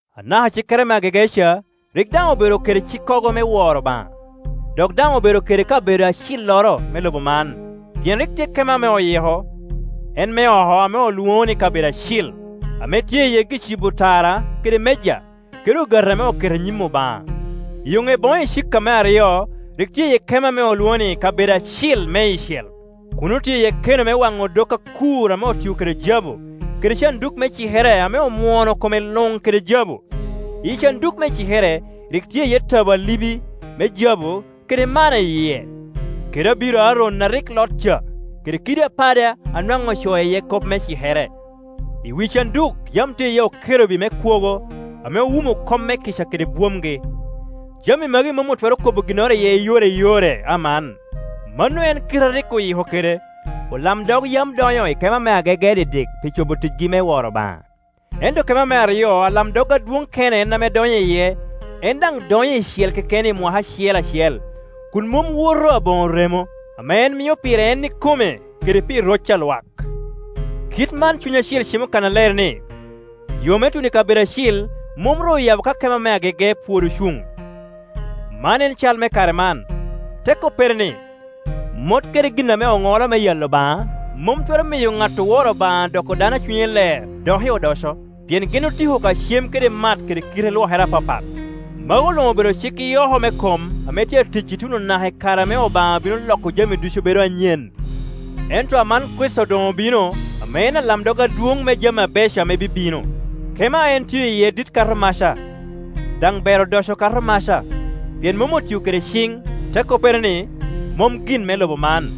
Anaka cikere me agege ca rik daŋ obedo kede cikkogo me woro Obaŋa, dok daŋ obedo kede kabedo acilloro me lobo man. Pien rik tye kema ame oyiko, en me oko ame olwoŋo ni Kabedo Acil, ame tye iye gi-cibo tara kede meja, kede ogati ame oketo i nyim Obaŋa. I yoŋe boŋo icika me aryo rik tye iye kema ame olwoŋo ni Kabedo Acil Meicel. Kuno tye iye keno me waŋo odok akur ame otio kede jabu, kede canduk me cikere ame omwono kome luŋ kede jabu. Iyi canduk me cikere rik tye iye tabo alibi me jabu kede manna i yie, kede abiro Aron a rik lot ca, kede kiddi apada a nwaŋ ocoo iye kop me cikere. I wi canduk yam tye iye okerubi me kwogo, ame owumo komme-kica kede bwomgi. Jami magi mom otwero kobo ginnoro iye i yore i yore aman. Mano en kite a rik oyiko kede. Olamdog yam donyo i kema me agege didik pi cobo ticgi me woro Obaŋa. Ento kema me aryo alamdog adwoŋ kene en ame donyo iye, en daŋ donyo icel keken i mwaka acel acel, kun mom woto aboŋo remo, ame en mio pire en ikome kede pi roc a lwak. Kit man Cuny Acil cimo kannaler ni, yo me tuno i kabedo acil mom ru oyabo ka kema me agege pwod ocuŋ. Man en cal me kare man. Te koppere ni, mot kede gin ame oŋolo me yalo Obaŋa mom twero miyo ŋat oworo Obaŋa doko dano a cunye ler doki odoco, pien gin otiko ka cem kede mat kede kite lwokere apapat. Magu luŋ obedo cik i oko me kom ame tye atic ituno naka i kare ame Obaŋa bino loko jami ducu bedo anyen. Ento aman Kricito doŋ obino, ame en alamdog adwoŋ me jami abeco ame bibino. Kema a en tio iye dit kato maca, daŋ ber odoco kato maca, pien mom otio kede ciŋ, te koppere ni, mom gin me lobo man.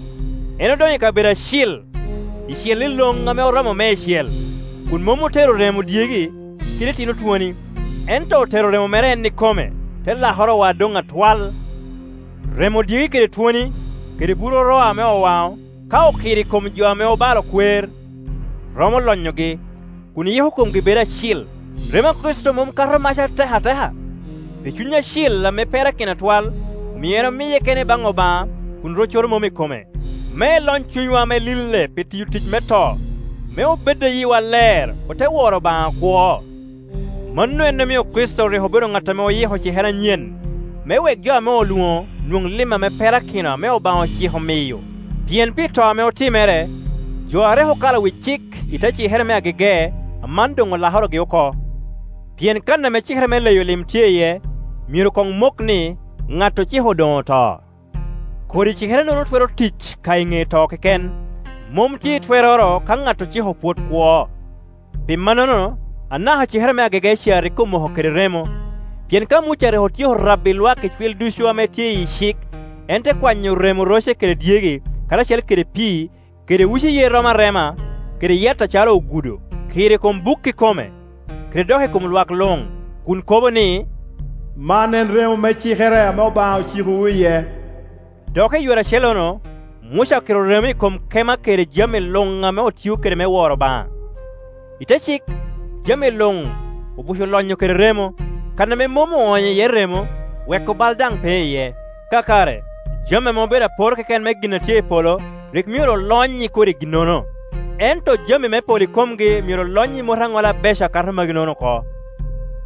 En odonyo i Kabedo Acil icel iloŋ ame oromo meicel, kun mom otero remo dyegi kede itino twoni, ento otero remo mere en ikome, te lakorowa doŋ atwal. Remo dyegi kede twoni, kede buru roa ame owaŋo, ka okiro i kom jo ame obalo kwer, romo lonyogi, kun yiko komgi bedo acil. Remo a Kricito mom kato maca atek ateka? Pi Cuny Acil ame perakino atwal, omio en omiye kene baŋ Obaŋa kun roccoro mom i kome, me elony cunywa ame lille pi tiyo tic me to, me obed a yiwa ler, ote woro Obaŋa akwo. Mano en omio Kricito rik obedo ŋat oyiko cikere anyen, me wek jo ame olwoŋo nwoŋo lim ame perakino ame Obaŋa ociko miyo; pien pi to ame otimere, jo a rik okalo wi cik i te cikere me agege aman doŋ olakorogi oko. Pien kan ame cikere me leyo lim tye iye, myero doŋ mok ni, ŋat ociko doŋ oto. Kodi cikere-nono twero tic ka i ŋe to keken; mom tye i twerroro ka ŋat ociko pwod kwo. Pi mannono anaka cikere me agege ca rik omoko kede remo. Pien ka Muca rik otyeko rabbi lwak icwil ducu ame tye iyi cik, en te kwanyo remo roce kede dyegi, karacel kede pii, kede uci yer romo arema, kede yat acalo ogudo, kiro i kom buk ikome, kede dok i kom lwak luŋ, kun kobo ni, “Man en remo me cikere ame Obaŋa ocikowu iye.” Dok i, yore acellono, Muca okiro remo i kom kema kede jami luŋ ame otio kede me woro Obaŋa. I te cik, jami luŋ obuco lonyo kede remo; kan ame mom oonyo iye remo, weko bal daŋ pe iye. Kakare, jami ame obedo apor keken me gin a tye i polo rik myero olony i kodi ginnono, ento jami me polo ikomgi myero olony i mot aŋola abeco akato magi-nono oko.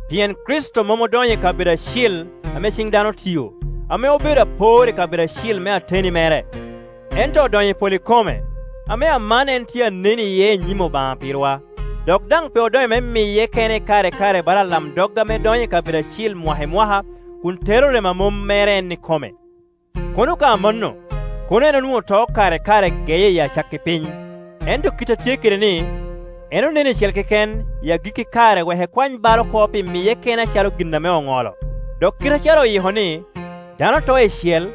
Pien Kricito mom odonyo i kabedo acil ame ciŋ dano otio, ame obedo apor i kabedo acil me ateni mere, ento odonyo i polo ikome, ame aman en tye a nen iye i nyim Obaŋa pirwa. Dok daŋ pe odonyo me miye kene kare i kare bala alamdog ame donyo i kabedo acil mwaka i mwaka kun tero remo a mom mere en ikome. Kono ka amanno, kono en onwoo to kare i kare geye i acakki piny. Ento kit a tye kede-ni, en onen icel keken i agikki kare wek ekwany bal oko pi miye kene acalo gin ame oŋolo. Dok kite acalo oyiko ni, dano to icel,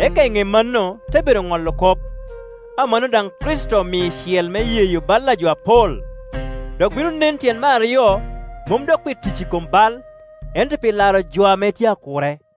eka i ŋe mano te bedo ŋolo kop, amanno daŋ Kricito omio icel me yeyo bal a jo apol, dok bino nen tyen me aryo, mom dok pi tic i kom bal, ento pi laro jo ame tye akure.